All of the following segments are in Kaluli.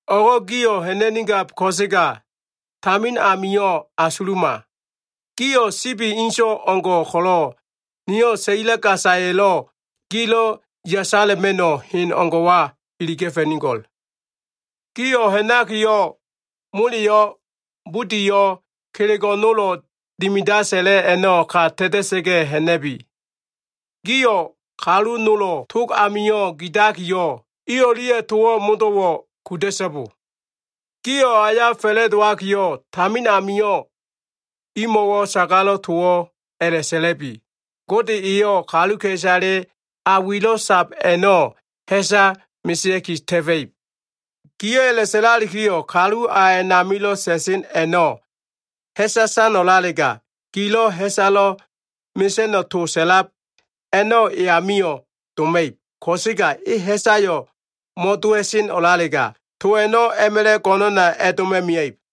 O꞉go꞉ gio꞉ ha꞉na꞉nigab ko꞉sega tamin amio꞉ asuluma. Gio꞉ sibi inso꞉ o꞉ngo꞉ ko꞉lo꞉, niyo꞉ saila gasaya꞉lo꞉ gilo꞉ yasala꞉ma꞉no꞉ hen o꞉ngo꞉wa iliga꞉fa꞉nigo꞉l. Gio꞉ ha꞉nakiyo꞉, moleyo꞉, budiyo꞉, kelego꞉ nolo꞉ dimida sa꞉la꞉ a꞉no꞉ ka ta꞉ta꞉sa꞉ga꞉ ha꞉na꞉bi. Gio꞉ kalu nolo꞉ tog amio꞉ gidakiyo꞉, i o꞉lia꞉ towo꞉ modo꞉wo꞉ kuda꞉so꞉bo. Gio꞉ aya fa꞉la꞉dowakiyo꞉, tamin amio꞉ imo꞉wo꞉ sagalo꞉ towo꞉ a꞉la꞉sa꞉la꞉bi, ‘Gode eyo꞉ kaluka꞉isale a wilo꞉ sab a꞉no꞉ ha꞉sa mesea꞉ki ta꞉fa꞉ib.’ Gio꞉ a꞉la꞉sa꞉lalikiyo꞉, kalu a a꞉namilo꞉ sa꞉sen a꞉no꞉ ha꞉sa san o꞉lalega, gilo꞉ ha꞉salo꞉ mesa꞉no꞉ to sa꞉lab a꞉no꞉ e amio꞉ doma꞉ib. Ko꞉sega e ha꞉sayo꞉ mo꞉dowa꞉sen o꞉lalega, to a꞉no꞉ a꞉ma꞉la꞉ go꞉no꞉na a꞉doma꞉ mia꞉ib.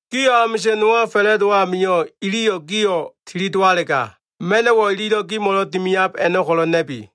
Gio꞉ amisa꞉n nowa fa꞉la꞉dowo꞉ amio꞉, iliyo꞉ gio꞉ tilidowalega, ma꞉no꞉wo꞉ ililo꞉ gimo꞉lo꞉ dimiab a꞉no꞉ ko꞉lo꞉ na꞉bi.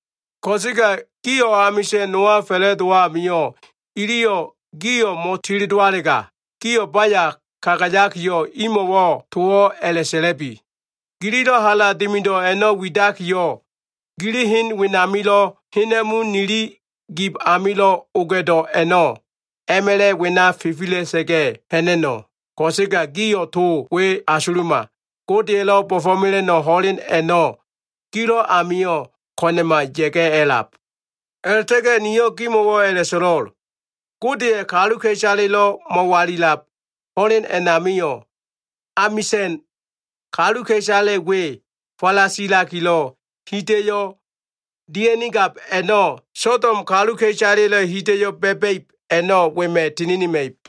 Ko꞉sega gio꞉ amisa꞉n nowa fa꞉la꞉dowo꞉ amio꞉, iliyo꞉ gio꞉ mo꞉tilidowalega, gio꞉ baya kagayakiyo꞉, imo꞉wo꞉ towo꞉ a꞉la꞉sa꞉labi, ‘Gililo꞉ hala dimido꞉ a꞉no꞉ widakiyo꞉, gili hen wenamilo꞉ hena꞉mu nili gib amilo꞉ oga꞉do꞉ a꞉no꞉, a꞉ma꞉la꞉ wena fifila꞉sa꞉ga꞉ ha꞉na꞉no꞉. Ko꞉sega gio꞉ to we asuluma. Godeya꞉lo꞉ bo꞉fo꞉mela꞉no꞉ ho꞉len a꞉no꞉ gilo꞉ amio꞉ ko꞉na꞉ma ya꞉ga꞉ a꞉lab.’ A꞉la꞉ta꞉ga꞉ niyo꞉ gimo꞉wo꞉ a꞉la꞉so꞉lo꞉l. Godeya꞉ kaluka꞉isalelo꞉ mo꞉walilab ho꞉len a꞉namio꞉, amisa꞉n kaluka꞉isale we falasilakilo꞉ hida꞉yo꞉ dia꞉nigab a꞉no꞉, Sodom kaluka꞉isaleya꞉lo꞉ hida꞉yo꞉ ba꞉ba꞉ib a꞉no꞉ wema꞉ tininima꞉ib.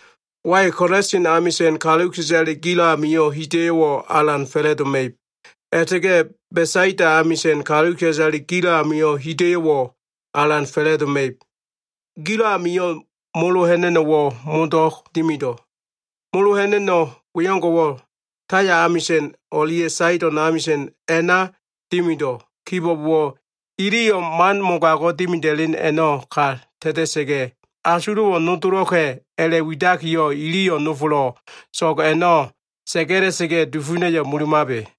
“Wai, Kolasin amisa꞉n kaluka꞉isale gilo꞉ amio꞉ hida꞉yo꞉wo꞉ alan fa꞉la꞉doma꞉ib. A꞉la꞉ta꞉ga꞉ Besaida amisa꞉n kaluka꞉isale gilo꞉ amio꞉lo꞉ hida꞉yo꞉wo꞉ alan fa꞉la꞉doma꞉ib. Gilo꞉ amio꞉ molo ha꞉na꞉no꞉wo꞉ modo꞉ dimido꞉. Molo ha꞉na꞉no꞉ wengo꞉wo꞉ Taya amisa꞉n o꞉lia꞉ Saido꞉n amisa꞉n a꞉na dimido꞉ kibo꞉bowo꞉, iliyo꞉ man mogago꞉ dimida꞉len a꞉no꞉ ka ta꞉ta꞉sa꞉ga꞉, asulo꞉wo꞉ nodolo꞉ka꞉ a꞉la꞉widakiyo꞉, iliyo꞉ nofolo꞉ so꞉g a꞉no꞉ sa꞉ga꞉la꞉sa꞉ga꞉, dufuna꞉yo꞉ mulumabe.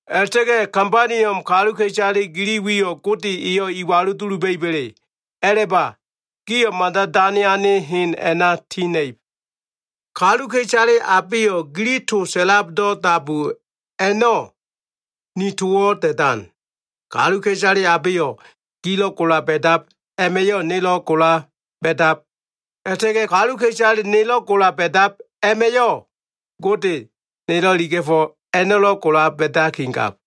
A꞉la꞉ta꞉ga꞉ Kabaniom kaluka꞉isale gili wiyo꞉ Gode eyo꞉ iwalu duluba꞉iba꞉le? A꞉la꞉ba, gio꞉ mada dane ane hen a꞉na ti ha꞉na꞉ib. “Kaluka꞉isale abeyo꞉ gili to sa꞉labdo꞉ dabu a꞉no꞉, ni towo꞉ da꞉dan. Kaluka꞉isale abeyo꞉ gilo꞉ gola ba꞉dab a꞉ma꞉yo꞉ nelo꞉ gola ba꞉dab. A꞉la꞉ta꞉ga꞉ kaluka꞉isale nelo꞉ gola ba꞉dab a꞉ma꞉yo꞉, Gode nelo꞉ iliga꞉fo꞉ a꞉no꞉lo꞉ gola ba꞉dakigab.”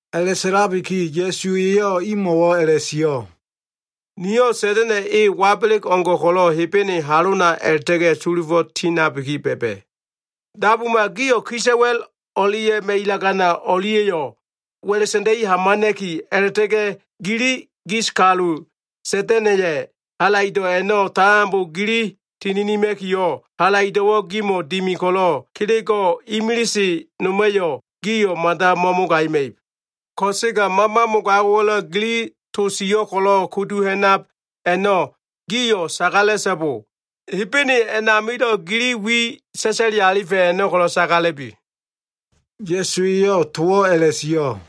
A꞉la꞉sa꞉labiki Ya꞉su eyo꞉ imo꞉wo꞉ a꞉la꞉sio꞉, “Niyo꞉ Sa꞉da꞉na꞉ e, wabeleg o꞉ngo꞉ ko꞉lo꞉ Hebene halona a꞉la꞉ta꞉ga꞉ sulufo꞉ tindabiki ba꞉ba꞉. Dabuma. Gio꞉ kisa꞉wa꞉l o꞉lia꞉ ma꞉ilagana o꞉lia꞉yo꞉ wa꞉la꞉ sa꞉nda꞉i hamana꞉ki, a꞉la꞉ta꞉ga꞉ gili gis kalu, Sa꞉da꞉na꞉ya꞉ halaido꞉ a꞉no꞉ tambo gili tininima꞉kiyo꞉, halaido꞉wo꞉ gimo꞉ dimi ko꞉lo꞉, kelego꞉ imilise noma꞉yo꞉ gio꞉ mada mo꞉mogagima꞉ib. Ko꞉sega mama mogago꞉wa꞉lo꞉ gili to sio꞉ ko꞉lo꞉ kudu ha꞉nab a꞉no꞉, gio꞉ sagala꞉so꞉bo. Hebene a꞉namilo꞉ gili wi sa꞉sa꞉li alifa꞉ a꞉no꞉ ko꞉lo꞉ sagala꞉bi.” Ya꞉su eyo꞉ towo꞉ a꞉la꞉sio꞉.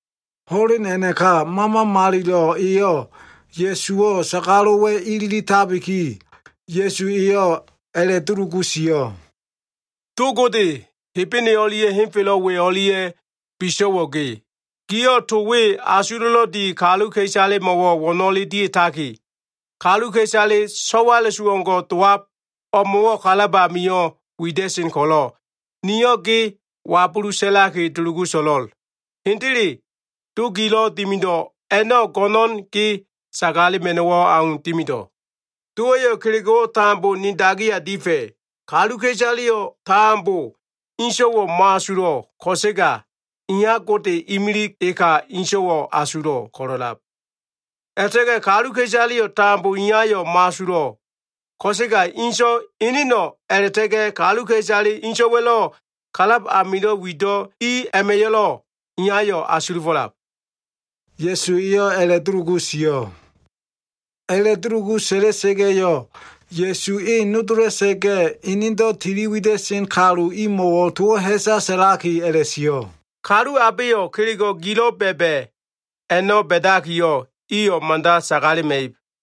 Ho꞉len a꞉naka, Mama Malilo꞉ eyo꞉ Ya꞉suwo꞉ sagalo꞉wa꞉ ililitabiki, Ya꞉su eyo꞉ a꞉la꞉dulugu sio꞉. “Do Gode, Hebene o꞉lia꞉ henfelo꞉ we o꞉lia꞉lo꞉ biso꞉wo꞉ ge. Giyo꞉ to we asulo꞉lo꞉ di kaluka꞉isalemo꞉wo꞉ wo꞉no꞉le dia꞉taki, kaluka꞉isale so꞉wala꞉su o꞉ngo꞉ dowab o꞉mo꞉wo꞉ kalab amio꞉ wida꞉sen ko꞉lo꞉, niyo꞉ ge wabulu sa꞉laki, dulugu so꞉lo꞉l. Hendele Do gilo꞉ dimido꞉ a꞉no꞉, go꞉no꞉n ge sagalema꞉no꞉wo꞉ au dimido꞉. Dowa꞉yo꞉ kelego꞉wo꞉ tambo ni dagiya difa꞉. Kaluka꞉isaleyo꞉ tambo ene So꞉wa a꞉no꞉ mo꞉asulo꞉ ko꞉sega, Iya Gode imilig eka So꞉wayo꞉ asulo꞉ ko꞉lo꞉lab. A꞉la꞉ta꞉ga꞉ kaluka꞉isaleyo꞉ tambo Iyayo꞉ mo꞉asulo꞉ ko꞉sega, So꞉wa eneno꞉ a꞉la꞉ta꞉ga꞉ kaluka꞉isale So꞉waya꞉lo꞉ kalab amilo꞉ wido꞉ i a꞉ma꞉yo꞉lo꞉, Iyayo꞉ asulufo꞉lab.” Ya꞉su eyo꞉ a꞉la꞉dulugu sio꞉. A꞉la꞉dulugu sa꞉la꞉sa꞉ga꞉yo꞉, Ya꞉su e nodola꞉sa꞉ga꞉, enedo꞉ tili wida꞉sen kalu imo꞉wo꞉ towo꞉ ha꞉sa sa꞉laki a꞉la꞉sio꞉, “Kalu abeyo꞉ kelego꞉ gilo꞉ ba꞉ba꞉ a꞉no꞉ ba꞉dakiyo꞉, iyo꞉ mada sagalema꞉ib.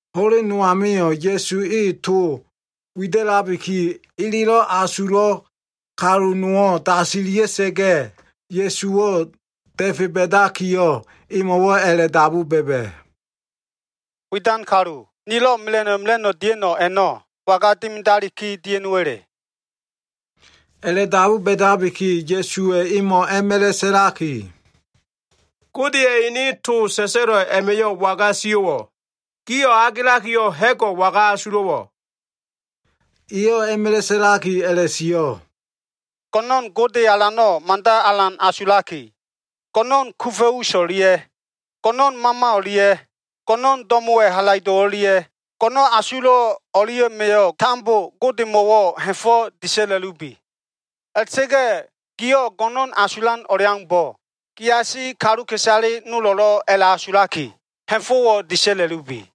Ho꞉len no amio꞉ Ya꞉su e to wida꞉labiki, elelo꞉ asulo꞉ kalu nowo꞉ dasilia꞉sa꞉ga꞉, Ya꞉suwo꞉ da꞉fe ba꞉dakiyo꞉, emo꞉wo꞉ a꞉la꞉dabu ba꞉ba꞉. “Widan kalu, nilo꞉ mela꞉no꞉ mela꞉no꞉ dia꞉no꞉ a꞉no꞉, waga dimidaliki dia꞉no꞉wa꞉le?” A꞉la꞉dabu ba꞉dabiki, Ya꞉suwa꞉ a꞉ma꞉la꞉ emo꞉ sa꞉laki, “Godeya꞉ ene to sa꞉sa꞉lo꞉ a꞉ma꞉yo꞉ waga sio꞉wo꞉? Giyo꞉ agelakiyo꞉, ha꞉go꞉ waga asulo꞉wo꞉?” Eyo꞉ a꞉ma꞉la꞉ sa꞉laki a꞉la꞉sio꞉, “Go꞉no꞉n Gode Alano꞉ mada alan asulaki, go꞉no꞉n kufa꞉ us o꞉lia꞉, go꞉no꞉n mama o꞉lia꞉, go꞉no꞉n do꞉mo꞉wa꞉ halaido꞉ o꞉lia꞉, go꞉no꞉n asulo꞉ o꞉lia꞉ma꞉yo꞉ tambo Godemo꞉wo꞉ ha꞉fo꞉ disa꞉la꞉bi. A꞉la꞉ta꞉ga꞉ gio꞉ go꞉no꞉n asulan o꞉leaumbo꞉, giasi kaluka꞉isale nolo꞉lo꞉ a꞉la꞉asulaki ha꞉fo꞉wo꞉ disa꞉la꞉lubi.”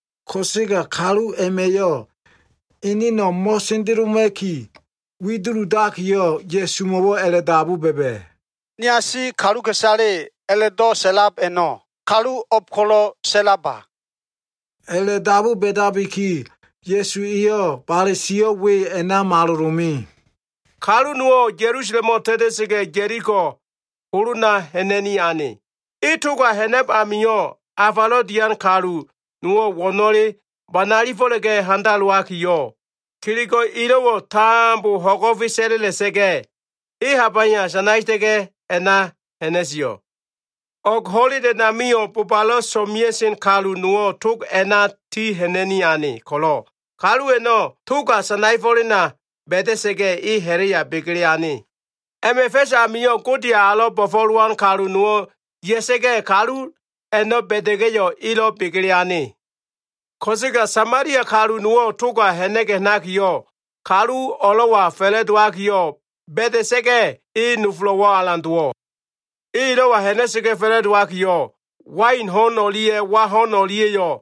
Ko꞉sega kalu a꞉ma꞉yo꞉ eneno꞉ mo꞉sendeloma꞉ki, wi duludakiyo꞉, Ya꞉sumo꞉wo꞉ a꞉la꞉dabu ba꞉ba꞉, “Niasi kaluka꞉isale a꞉la꞉do꞉ sa꞉lab a꞉no꞉ kalu o꞉b ko꞉lo꞉ sa꞉laba?” A꞉la꞉dabu ba꞉dabiki, Ya꞉su eyo꞉ bale sio꞉ we a꞉na malolo꞉ me. “Kalu nowo꞉ Ya꞉lusalemo꞉ ta꞉ta꞉sa꞉ga꞉, Ya꞉liko holona ha꞉na꞉ni ane. E toga ha꞉nab amio꞉, afalo꞉ dian kalu nolo꞉ wo꞉no꞉le banaefo꞉la꞉ga꞉ handalowakiyo꞉, kelego꞉ elo꞉wo꞉ tambo ho꞉go꞉fe sa꞉la꞉la꞉sa꞉ga꞉, e habaya sanaeta꞉ga꞉ a꞉na ha꞉na꞉sio꞉. O꞉g ho꞉len a꞉namio꞉, bobalo꞉ so꞉mea꞉sen kalu nowo꞉ tog a꞉na ti ha꞉na꞉ni ane ko꞉lo꞉, kalu a꞉no꞉ toga sanaefo꞉lena ba꞉da꞉sa꞉ga꞉, e ha꞉la꞉ya begele ane. A꞉ma꞉ fa꞉s amio꞉, Godeya꞉ alo꞉ bo꞉fo꞉lowan kalu nowo꞉ ya꞉sa꞉ga꞉, kalu a꞉no꞉ ba꞉da꞉ga꞉yo꞉, elo꞉ begele ane. “Ko꞉sega Samalia kalu nowo꞉ toga ha꞉na꞉ga꞉ ha꞉nakiyo꞉, kalu o꞉lo꞉wa fa꞉la꞉dowakiyo꞉ ba꞉da꞉sa꞉ga꞉, e nofolo꞉wo꞉ alan dowo꞉. E elo꞉wa ha꞉na꞉sa꞉ga꞉ fa꞉la꞉dowakiyo꞉, wain ho꞉n o꞉lia꞉ wa ho꞉n o꞉lia꞉yo꞉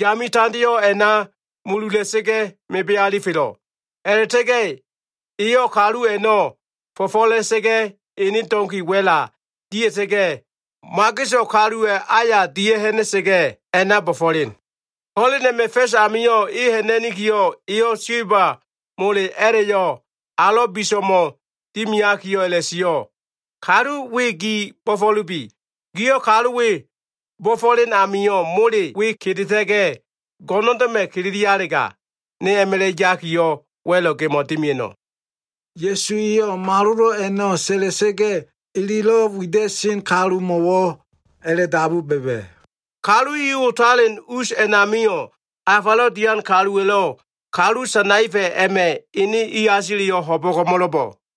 yame tandeo꞉ a꞉na mulula꞉sa꞉ga꞉ mebe alifelo꞉. A꞉la꞉ta꞉ga꞉ eyo꞉ kalu a꞉no꞉ fo꞉fo꞉la꞉sa꞉ga꞉, ene donki wa꞉la dia꞉ta꞉ga꞉, mageso꞉ kaluwa꞉ aya dia꞉ha꞉na꞉sa꞉ga꞉, a꞉na bo꞉fo꞉len. Ho꞉len a꞉ma꞉ fa꞉s amio꞉ e ha꞉na꞉nikiyo꞉, eyo꞉ silba mole a꞉la꞉yo꞉ alo꞉ biso꞉mo꞉ dimiakiyo꞉ a꞉la꞉sio꞉, ‘Kalu we gi bo꞉fo꞉lubi. Giyo꞉ kalu we bo꞉fo꞉len amio꞉, mole we kedeta꞉ga꞉, go꞉ndo꞉ma꞉ kililialega, ne a꞉ma꞉la꞉ yakiyo꞉, wa꞉lo꞉ gemo꞉wo꞉ dimia꞉no꞉.’” Ya꞉su eyo꞉ malolo꞉ a꞉no꞉ sa꞉la꞉sa꞉ga꞉, elelo꞉ wida꞉sen kalumo꞉wo꞉ a꞉la꞉dabu ba꞉ba꞉, “Kalu i otalen us a꞉namio꞉, afalo꞉ dian kaluwa꞉lo꞉ kalu sanaefa꞉ a꞉ma꞉ ene iasileyo꞉ ho꞉bo꞉ko꞉mo꞉lo꞉bo꞉?”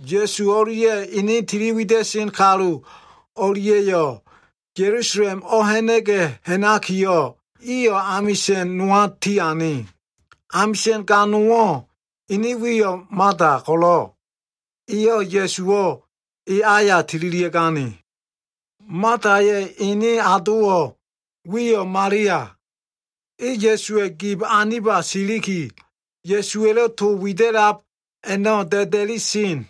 Ya꞉su o꞉lia꞉ ene tiliwida꞉sen kalu i o꞉lia꞉yo꞉ Ya꞉lusalem o꞉ha꞉na꞉ga꞉ ha꞉nakiyo꞉, iyo꞉ amisa꞉n nowa tiane. Amisa꞉n ga nowo꞉ ene wiyo꞉ Mata ko꞉lo꞉, eyo꞉ Ya꞉suwo꞉ e aya tililia꞉gane. Mataya꞉ ene adowo꞉ wiyo꞉ Malia. E Ya꞉suwa꞉ gib aniba siliki, Ya꞉suwa꞉lo꞉ to wida꞉lab a꞉no꞉ da꞉da꞉li sen.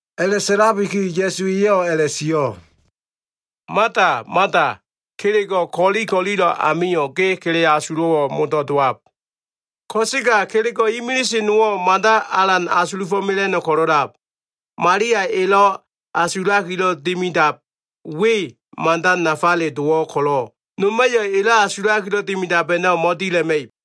A꞉la꞉sa꞉labiki Ya꞉su eyo꞉ a꞉la꞉sio꞉, “Mata, Mata, kelego꞉ ko꞉li ko꞉lilo꞉ amio꞉ ge kele asulo꞉wo꞉ modo꞉ dowab. Ko꞉sega kelego꞉ imilise nowo꞉ mada alan asulufo꞉ mela꞉no꞉ ko꞉lo꞉lab. Malia elo꞉ asulakilo꞉ dimidab we mada nafale dowo꞉ ko꞉lo꞉, noma꞉yo꞉ elo꞉ asulakilo꞉ dimidab a꞉no꞉ mo꞉dila꞉ma꞉ib.”